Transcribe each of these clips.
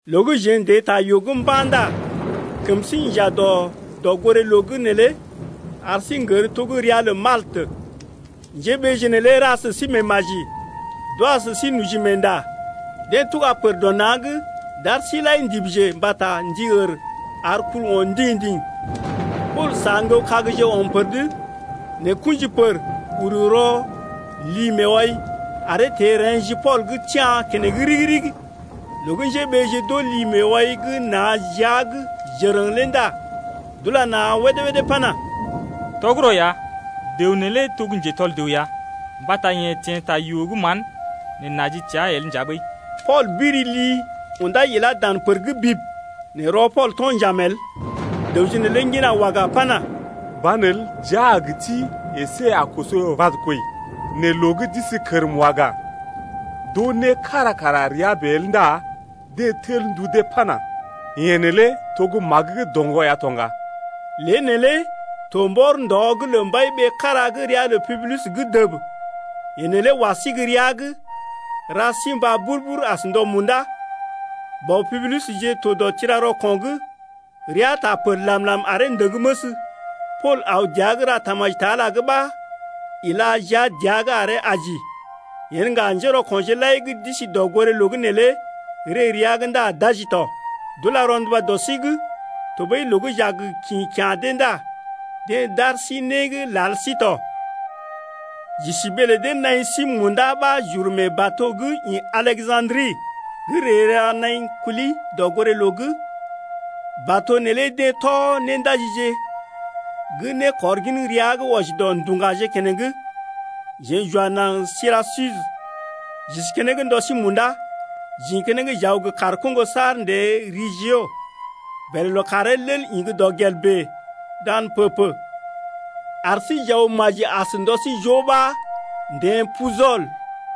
Loo gə́ jeḛ n’teḛ ta yoo’g mba̰ ndá kəm sí inja dɔ dɔgoré-loo’g neelé ar sí n’gər to gə́ ria lə Maltə. Njéɓeeje neelé ra sə sí meemaji d’wa sə sí noji meenda. Deḛ tuga pər dɔ na̰’g d’ar sí lai ndibije mbata ndi ər ar kul o̰ ndiŋ-ndiŋ. Pool sa ŋgəw kagje ɔm pəd, nɛ kṵji pər uru rɔ li-meewai’g aree teḛ reḛ́ ji Pool’g tia̰ keneŋ ɗigi-ɗigi. Loo gə́ njéɓeeje d’oo li-meewai gə́ nà jia’g jərəŋ lé ndá d’ula na̰ wédé-wédé pana: Tɔgərɔ ya, dəw neelé to gə́ njetɔl dəw ya, mbata yeḛ teḛ ta yoo gə́ mán, nɛ naji teá el nja ɓəi. Pool biri li undá ilá dan pər’g bib, nɛ rɔ Pool to̰ njaam el. Dəwje neelé ŋgina waga pana: Banelə jia a gə ti əsé a koso vad kwəi. Nɛ loo gə́ d’isi kərm waga, d’oo né kára kara rəa bèe el ndá deḛ tel ndu dee pana: Yeḛ neelé to gə́ magə gə́ doŋgɔ ya to ŋga. Lée neelé to mbɔr ndɔ’g lə mbai-ɓee kára gə́ ria lə Publius’g dəb. Yeḛ neelé wa sí gə́ rəa’g ra sí mbá bur-bur as ndɔ munda. Bɔ Publiusje to dɔ tira-rɔko̰’g, rəa taa pər làm-làm aree ndəŋ məs. Pool aw dəa’g ra tamaji ta Ala’g ɓa ila jia dəa’g aree aji. Yen ŋga njérɔko̰je lai gə́ d’isi dɔgoré-loo’g neelé ree rəa’g ndá d’aji tɔ. D’ula rɔnduba dɔ sí’g, tɔɓəi loo gə́ j’a gə kḭ kya̰ dee ndá deḛ d’ar sí né gə́ lal sí tɔ. J’isi ɓee lə dee naḭ sí munda ɓa j’uru mee bato gə́ ḭ Aleja̰dri gə́ ree ra naḭ kuli dɔgoré-loo’g, bato neelé deḛ tɔ néndaji gə́ nékɔr gin ria gə́ wɔji dɔ Nduŋgaje gə́ to ŋgako̰ na̰je keneŋ. Jeḛ j’wa naŋg Sirakusə j’isi keneŋ ndɔ sí munda. J’ḭ keneŋ j’aw gə kaar koŋgo’g saar n’teḛ Reggio, bèlè lookàree lel ḭ gə́ dɔkɔl bèe dan pə-pə ar sí j’aw maji as ndɔ sí joo ɓa n’teḛ Pujɔl,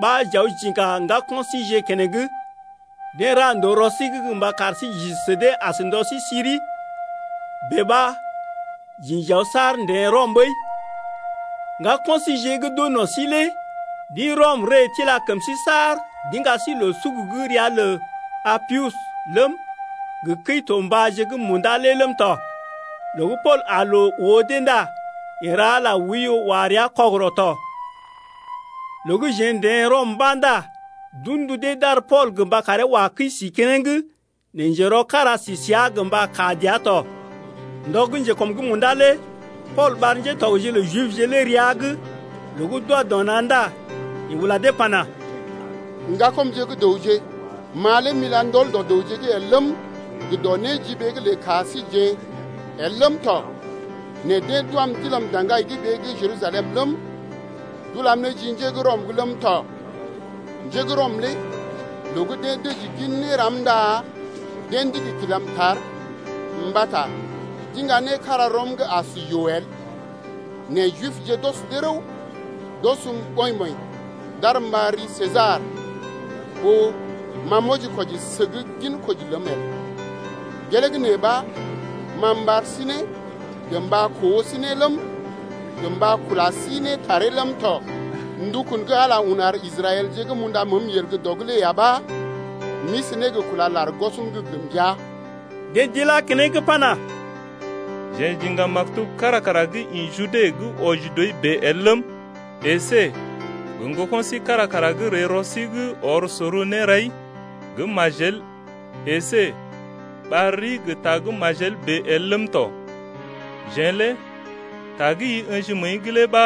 ɓa j’aw j’iŋga ŋgako̰ síjeḛ keneŋ. Deḛ ra ndòo rɔ sí’g mba kar sí j’isi sə dee as ndɔ sí siri. Bèe ɓa j’ḭ j’aw saar n’teḛ Rɔm ɓəi. Ŋgako̰ síjeḛ gə́ d’oo no̰ sí lé d’ḭ Rɔm ree tila kəm sí saar d’iŋga sí loo-suk gə́ ria lə Apius ləm, gə Kəi-to-mbàje gə́ Munda lé ləm tɔ. Loo gə́ Pool aa loo oo dee ndá yeḛ ra Ala oiyo wa rəa kɔgərɔ tɔ. Loo gə́ jeḛ n’teḛ Rɔm mba̰ ndá d’un ndu dee d’ar Pool gə mba karee wa kəi sí keneŋ, nɛ njerɔ kára sí səa gə mba kaa dəa tɔ. Ndɔ gə́ njekɔm’g munda lé Pool ɓar ŋgatɔgje lə Jibje lé rəa’g. Loo gə́ d’wa dɔ na̰ ndá yeḛ ula dee pana: Ŋgakɔmje gə́ dəwje, ma lé m’ila ndɔl dɔ dəwje’g el ləm, gə dɔ néjiɓee’g lə ka síjeḛ el ləm tɔ nɛ deḛ d’wam d’ilam daŋgai ɓee gə́ Jerusalem ləm, d’ulam ne ji njé gə́ Rɔm’g ləm tɔ. Njé gə́ Rɔm lé loo gə́ deḛ dəji gin néram ndá deḛ ndigi kilam tar mbata d’iŋga né kára rɔm gə́ as yoo el. Nɛ Jibje d’ɔs dee rəw, d’ɔsm ɓɔḭ-ɓɔḭ d’arm m’ɓar ri Sesar ɓó ma m’wɔji-kwɔji səg ginkoji ləm el. Gelee gə́ nee ɓa ma m’ɓar sí ne gə mba koo sí ne ləm, gə mba kula sí ne taree ləm tɔ. Ndukun gə́ Ala un ar Israɛlje gə́ m’unda məəm yel dɔ’g lé ya ɓa m’isi ne gə kúla lar gwɔsm’g gə mbəa. Deḛ d’ilá keneŋ pana: Jeḛ j’iŋga maktub kára kara gə́ ḭ Jude gə́ wɔji dɔi bèe el ləm, əsé gə ŋgoko̰ sí kára kara gə́ ree rɔ sí’g ɔr sor nérai gə́ majel əsé ɓar rii gə ta gə́ majel bèe el ləm tɔ. Jeḛ lé ta gə́ i ə̰ji məəi’g lé ɓa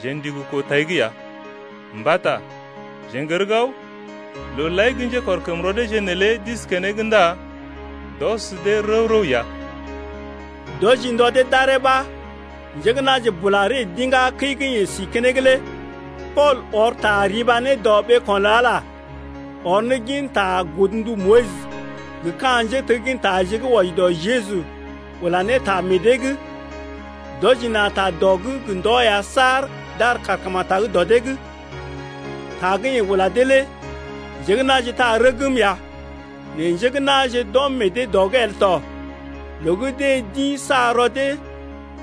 jeḛ ndigi koo tai’g ya, mbata jeḛ n’gər gao, looje lai gə́ njékɔrkəm rɔ deeje neelé d’isi keneŋ ndá d’ɔs dee rəw-rəw ya. D’wɔji ndɔ dee d’aree ɓa njé gə́ na̰je bula ree d’iŋgá kəi gə́ yeḛ si keneŋ lé. Pool ɔr ta riba ne dɔ ɓeeko̰ lə Ala, ɔr ne ginta godndu Moyis gə ka̰ njéteggintaje gə́ wɔji dɔ Jeju ula ne ta meḛ dee’g. D’wɔji na̰ ta dɔ’g gə ndɔ ya saar d’ar kàrkemetag dɔ dee’g. Ta gə́ yeḛ ula dee lé njé gə́ na̰je taa rəgm ya, nɛ njé gə́ na̰je d’ɔm meḛ dee dɔ’g el tɔ. Loo gə́ deḛ d’ḭ sa rɔ dee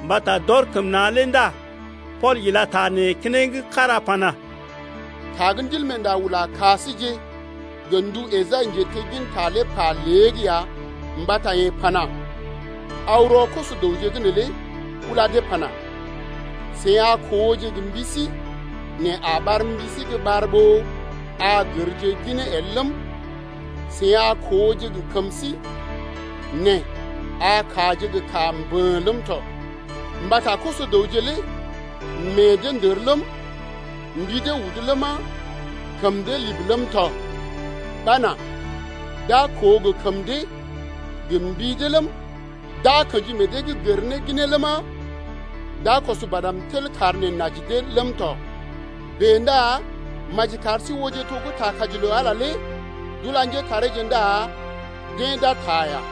mbata d’ɔr kəm na̰ lé ndá Pool ila ta nee keneŋ kára pana: Ta gə́ Ndilmeenda ula ka síje gə ndu Esai njetegginta lé pa lée’g ya mbata yeḛ pana: Aw rɔ koso-dəwje’g neelé ula dee pana: Seḭ a kooje gə mbi sí nɛ a ɓar mbi sí gə́ ɓar ɓó a gərje ginee el ləm, Seḭ a kooje gə kəm sí nɛ a kaaje gə́ kaa mbə̰ ləm tɔ. Mbata koso-dəwje lé meḛ dee ndər ləm, Mbi dee udu ləma, kəm dee libi ləm tɔ, Ɓa nà d’a koo gə kəm dee gə mbi dee ləm, D’a kḛji meḛ dee’g gər ne ginee ləma, D’a kɔs badm tel kar neḛ n’aji dee ləm tɔ. Bèe ndá maji kar sí ooje to gə́ ta kaji lə Ala lé d’ula njétareeje ndá deḛ d’a taa ya.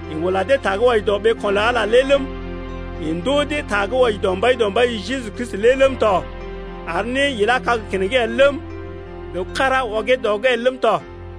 Yeḛ ula dee ta gə́ wɔji dɔ ɓeeko̰ lə Ala lé ləm, yeḛ ndoo dee ta gə́ wɔji dɔ Mbaidɔmbaije Jeju Kristi lé ləm tɔ, ar né ilá kag keneŋ el ləm, dəw kára ɔgee dɔ’g el ləm tɔ.